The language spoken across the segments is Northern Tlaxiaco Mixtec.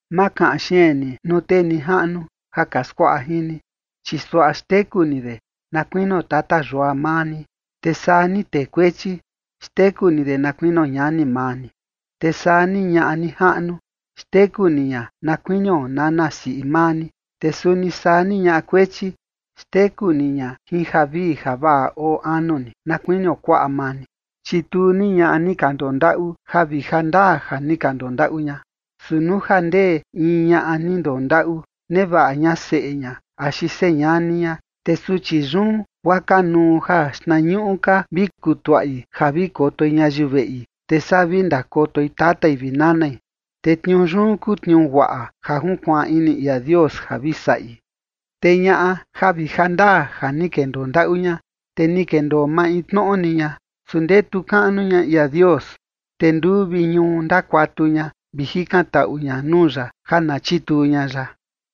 Ma kaꞌan xeen ni nuu tee nijaꞌnu ja ka skuaꞌa jin ni, chi suaꞌa xteku ni de na kuinio tata yua maa ni. Te saa ni tee kuechi, xteku ni de na kuinio ñani maa ni. Te saa ni ñaꞌa nijaꞌnu, xteku ni ña na kuinio nana siꞌi maa ni. Te suni saa ni ñaꞌa kuechi, xteku ni ña jin javii javaꞌa oo anu ni, na kuinio kuaꞌa maa ni. Chituu ni ñaꞌa ni ka ndondaꞌu ja vi ja ndaa ja ni ka ndondaꞌu ña. Su nuu ja ndee in ñaꞌa ni ndondaꞌu, nevaꞌa ña seꞌe ña axi señani ña, te suchi yun guaa kanuu ja xtnañuꞌu ka vi kutuaꞌi ja vi kotoi ñayiu veꞌi, te saa vi ndakotoi tatai vi nanai. Te tniuu yun kuu tniuu guaꞌa ja junkuaan ini ia Dios ja vi saꞌi. Te ñaꞌa ja vi ja ndaa ja ni kendoo ndaꞌu ña, te ni kendoo maintnoꞌo ni ña, su ndetu kaꞌnu ña ia Dios, te nduu vi ñuu ndakuatu ña vi jikan taꞌu ña nuu ya ja na chituu ña ya.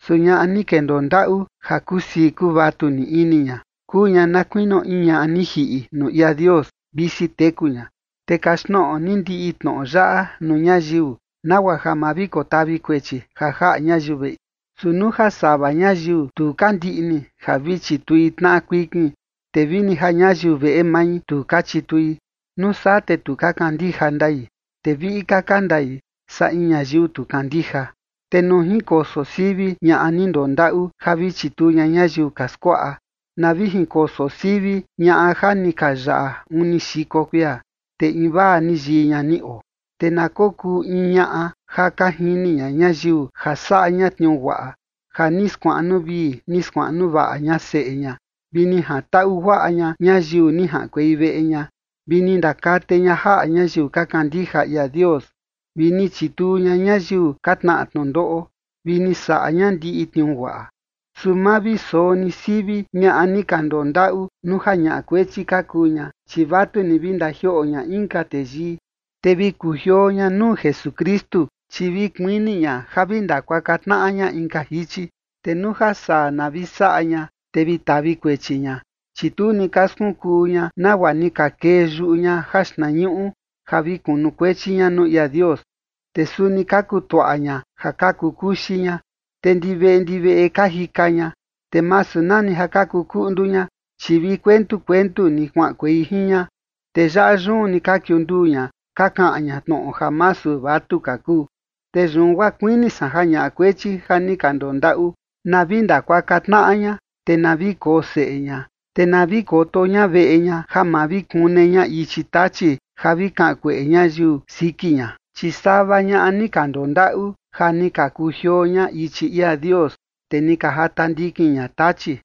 Su ñaꞌa ni kendoo ndaꞌu ja kusii kuvatu ni ini ña kuu ña na kuinio in ñaꞌa ni jiꞌi nuu ia Dios, visi teku ña. Te kaxtnoꞌo ni ndiꞌi tnoꞌo yaꞌa nuu ñayiu, nagua ja ma vi kotavi kuechi ja jaꞌa ñayiu veꞌi. Su nuu ja sava ñayiu tu ka ndiꞌni ja vi chitui tnaꞌa kuikin, te vini ja ñayiu veꞌe mai tu ka chitui, nuu saa te tu ka kandija ndai, te viꞌi ka ka ndai saa in ñayiu tu kandija. Te nuu jinkoso sivi ñaꞌa ni ndondaꞌu ja vi chituu ña ñayiu ka skuaꞌa, na vi jinkoso sivi ñaꞌa ja ni ka yaꞌa uni xiko kuia, te invaa ni yii ña ni oo. Te na kokuu in ñaꞌa ja ka jini ña ñayiu ja saꞌa ña tniuu guaꞌa, ja ni skuaꞌnu vii ni skuaꞌnu vaꞌa ña seꞌe ña, vi ni jantaꞌu guaꞌa ña ñayiu ni jaꞌankuei veꞌe ña, vi ni ndakate ña jaꞌa ñayiu ka kandija ia Dios, vi ni chituu ña ñayiu ka tnaꞌa tnundoꞌo, vi ni saꞌa ña ndiꞌi tniuu guaꞌa. Su ma vi soo ni sivi ñaꞌa ni ka ndondaꞌu nuu ja ñaꞌa kuechi ka kuu ña, chi vatu ni vi ndajioꞌo ña inka teyii, te vi kujioo ña nuu Jesukristu, chi vi kuini ña ja vi ndakuaka tnaꞌa ña inka jichi. Te nuu ja saa na vi saꞌa ña, te vi tavi kuechi ña, chi tu ni ka skunkuu ña nagua ni ka kee yuꞌu ña jaxtnañuꞌu ja vi kunukuechi ña nuu ia Dios. Te suni ka kutuaꞌa ña ja ka kukuxi ña, te ndi veꞌe ndi veꞌe ka jika ña. Te masu nani ja ka kukuꞌndu ña, chi vi kuentu kuentu ni kuaꞌankuei jin ña, te yaꞌa yun ni ka kiunduu ña ka kaꞌan ña tnoꞌo ja masu vatu ka kuu. Te yun guaa kuini san ja ñaꞌa kuechi ja ni ka ndondaꞌu, na vi ndakuaka tnaꞌa ña, te na vi koo seꞌe ña, te na vi koto ña veꞌe ña ja ma vi kune ña ichi Tachi ja vi kaꞌan kueꞌe ñayiu siki ña. Chi sava ñaꞌa ni ka ndondaꞌu ja ni ka kujioo ña ichi ia Dios, te ni ka jata ndikin ña Tachi.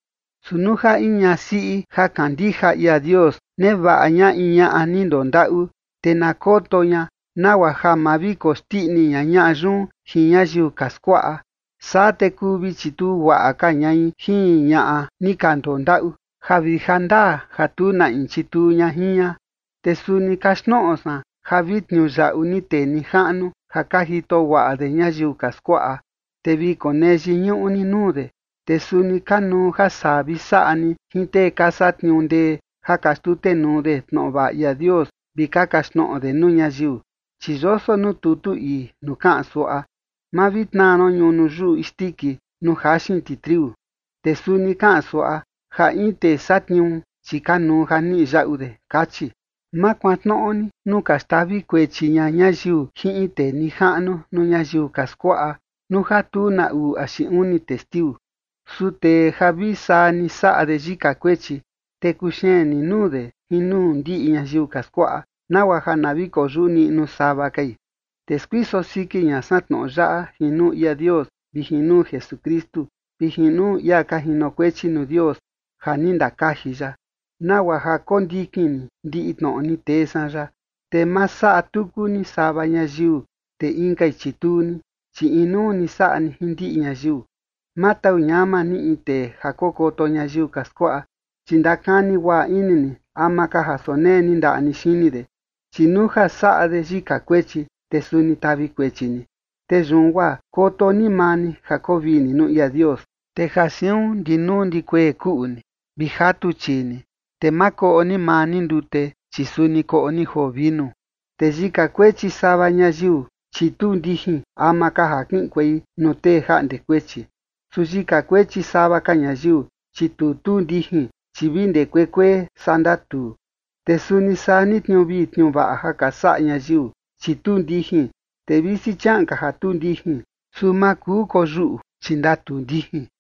Su nuu ja in ñasiꞌi ja kandija ia Dios, nevaꞌa ña in ñaꞌa ni ndondaꞌu, te na koto ña nagua ja ma vi koxndiꞌni ña ñaꞌa yun jin ñayiu ka skuaꞌa. Saa te kuu vi chituu guaꞌa ka ñai jin ñaꞌa ni ka ndondaꞌu, ja vi ja ndaa ja tu na in chituu ña jin ña. Te suni kaxtnoꞌo san ja vi tniuyaꞌu ni tee nijaꞌnu ja ka jito guaꞌa de ñayiu ka skuaꞌa, te vi konee yiñuꞌu ni nuu de, te suni kanuu ja saa vi saꞌa ni jin tee ka satniuu ndee ja ka xtutenuu de tnoꞌo vaꞌa ia Dios vi ka kaxtnoꞌo de nuu ñayiu. Chi yoso nuu tutu ii nuu kaꞌan suaꞌa: “Ma vi tnaa ron ñunu yuꞌu isndiki nuu ka jaxin ti triu” te suni kaꞌan suaꞌa: “Ja in tee satniuu, chi kanuu ja niꞌi yaꞌu de” kachi. Ma kuantnoꞌo ni nuu ka xtavi kuechi ña ñayiu jin in tee nijaꞌnu nuu ñayiu ka skuaꞌa nuu ja tu na uu axi uni testiu. Su tee ja vi saa ni saꞌa de yika kuechi, te kuxeen ni nuu de jin nuu ndiꞌi ñayiu ka skuaꞌa, nagua ja na vi koyuꞌu niꞌnu sava kai. Te skuiso siki ña san tnoꞌo yaꞌa jin nuu ia Dios vi jin nuu Jesukristu vi jin nuu ia ka jinokuechi nuu Dios ja ni ndakaji ya, nagua ja kondikin ni ndiꞌi tnoꞌo ni tee san yaꞌa, te ma saꞌa tuku ni sava ñayiu, te inkai chituu ni, chi inuu ni saꞌa ni jin ndiꞌi ñayiu. Ma tau ñama ni in tee ja kokoto ñayiu ka skuaꞌa, chi ndakani guaꞌa ini ni ama ka ja sonee ni ndaꞌa ni xini de, chi nuu ja saꞌa de yika kuechi, te suni tavi kuechi ni. Te yun guaa koto ni maa ni ja koo vii ni nuu ia Dios. Te ja siun ndi nuu ndi kuee kuꞌu ni vi jatu chii ni, te ma koꞌo ni maa ni ndute, chi suni koꞌo ni joo vinu. Te yika kuechi sava ñayiu, chi tuu ndijin ama ka ja kiꞌinkuei nuu tee jaꞌnde kuechi. Su yika kuechi sava ka ñayiu, chi tu tuu ndijin, chi vi ndee kuee kuee, saa ndatuu. Te suni saa ni tniuu vii tniuu vaꞌa ja ka saꞌa ñayiu, chi tuu ndijin, te visi chiaꞌan ka ja tuu ndijin, su ma kuu koyuꞌu, chi ndatuu ndijin.